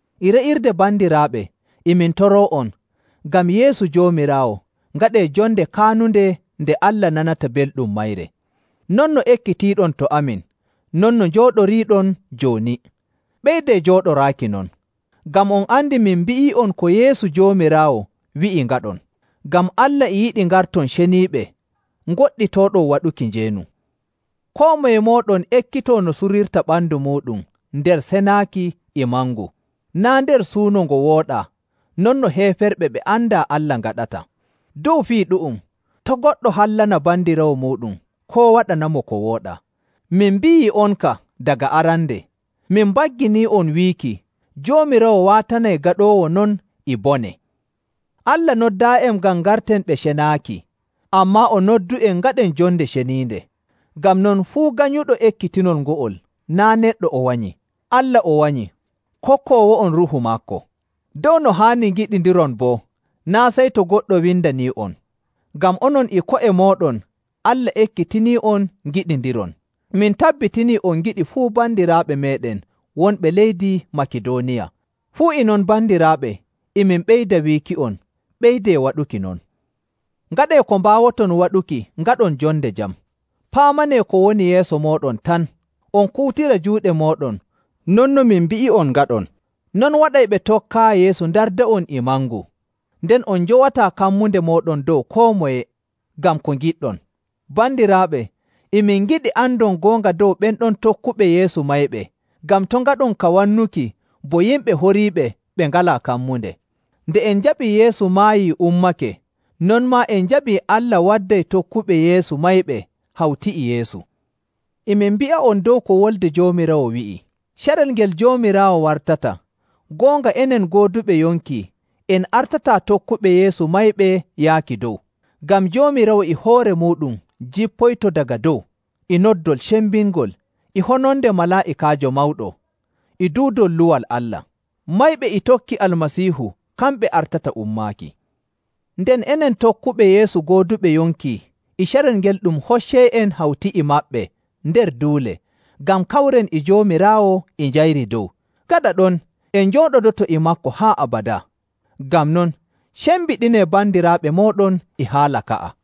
E re'irde bandiraaɓe, e min toroo'on, ngam Yeesu Joomiraawo, ngaɗee jonde kaanunde nde Allah nanata belɗum mayre, non no ekkitiiɗon to amin, non no njooɗoriiɗon jooni. Ɓeydee jooɗoraaki non. Ngam on andi min mbi'ii'on ko Yeesu Joomiraawo wi'i ngaɗon. Ngam Allah e yiɗi ngarton ceniiɓe, ngoɗɗitooɗon waɗuki njeenu. Koo moye mooɗon ekkitoo no surirta ɓandu muuɗum nder senaaki e mangu, naa' nder suuno ngo wooɗaa non no heeferɓe ɓe andaa Allah ngaɗata. Dow fii ɗu'um, to' goɗɗo hallana bandiraawo muuɗum koo waɗanamo ko wooɗaa. Min mbi'ii'on ka daga arande, min mbagginii'on wiiki, Joomiraawo waatanay gaɗoowo non e bone. Allah noddaayi'en ngam ngarten ɓe cenaaki, ammaa o noddu'en ngaɗen jonde ceniinde. Ngam non, fuu ganyuɗo ekkitinol ngo'ol, naa' neɗɗo o wanyi, Allah o wanyi, kokkoowo'on Ruuhu maako. Dow no haani ngiɗindiron boo, naa' sey to goɗɗo windanii'on, ngam onon e ko'e mooɗon Allah ekkitinii'on ngiɗindiron. Min tabbitinii on ngiɗi fuu bandiraaɓe meeɗen wonɓe leydi Makidooniya. Fuu e non bandiraaɓe, e min ɓeyda wiiki'on, ɓeydee waɗuki non. Ngaɗee ko mbaawoton waɗuki ngaɗon jonde jam, paamanee ko woni yeeso mooɗon tan, on kuutira juuɗe mooɗon non no min mbi'i'on ngaɗon. Non waɗay ɓe tokkaayi Yeesu ndarda'on e mangu, nden on njowataa kammunde mooɗon dow koo moye ngam ko ngiɗɗon. Bandiraaɓe, e min ngiɗi andon goonga dow ɓen ɗon tokkuɓe Yeesu mayɓe ngam to' ngaɗon ka wannuki bo yimɓe horiiɓe ɓe ngalaa kammunde. Nde en njaɓii Yeesu maayii ummake, non maa en njaɓii Allah wadday tokkuɓe Yeesu mayɓe hawti e Yeesu. E min mbi'a'on dow ko wolde Joomiraawo wi'i, carel ngel Joomiraawo wartata, goonga enen gooduɓe yonki en artataa tokkuɓe Yeesu mayɓe yaaki dow. Ngam Joomiraawo e hoore muuɗum jippoyto daga dow e noddol cembingol, e hononde malaa'ikaajo mawɗo, e duudol luwal Allah. Mayɓe e tokki Almasiihu kamɓe artata ummaaki. Nden enen tokkuɓe Yeesu gooduɓe yonki e carel ngel ɗum hoccay'en hawti e maɓɓe nder duule ngam kawren e Joomiraawo e njayri dow. Gaɗa ɗon en njooɗodoto e maako haa abadaa. Ngam non, cembiɗinee bandiraaɓe mooɗon e haala ka'a.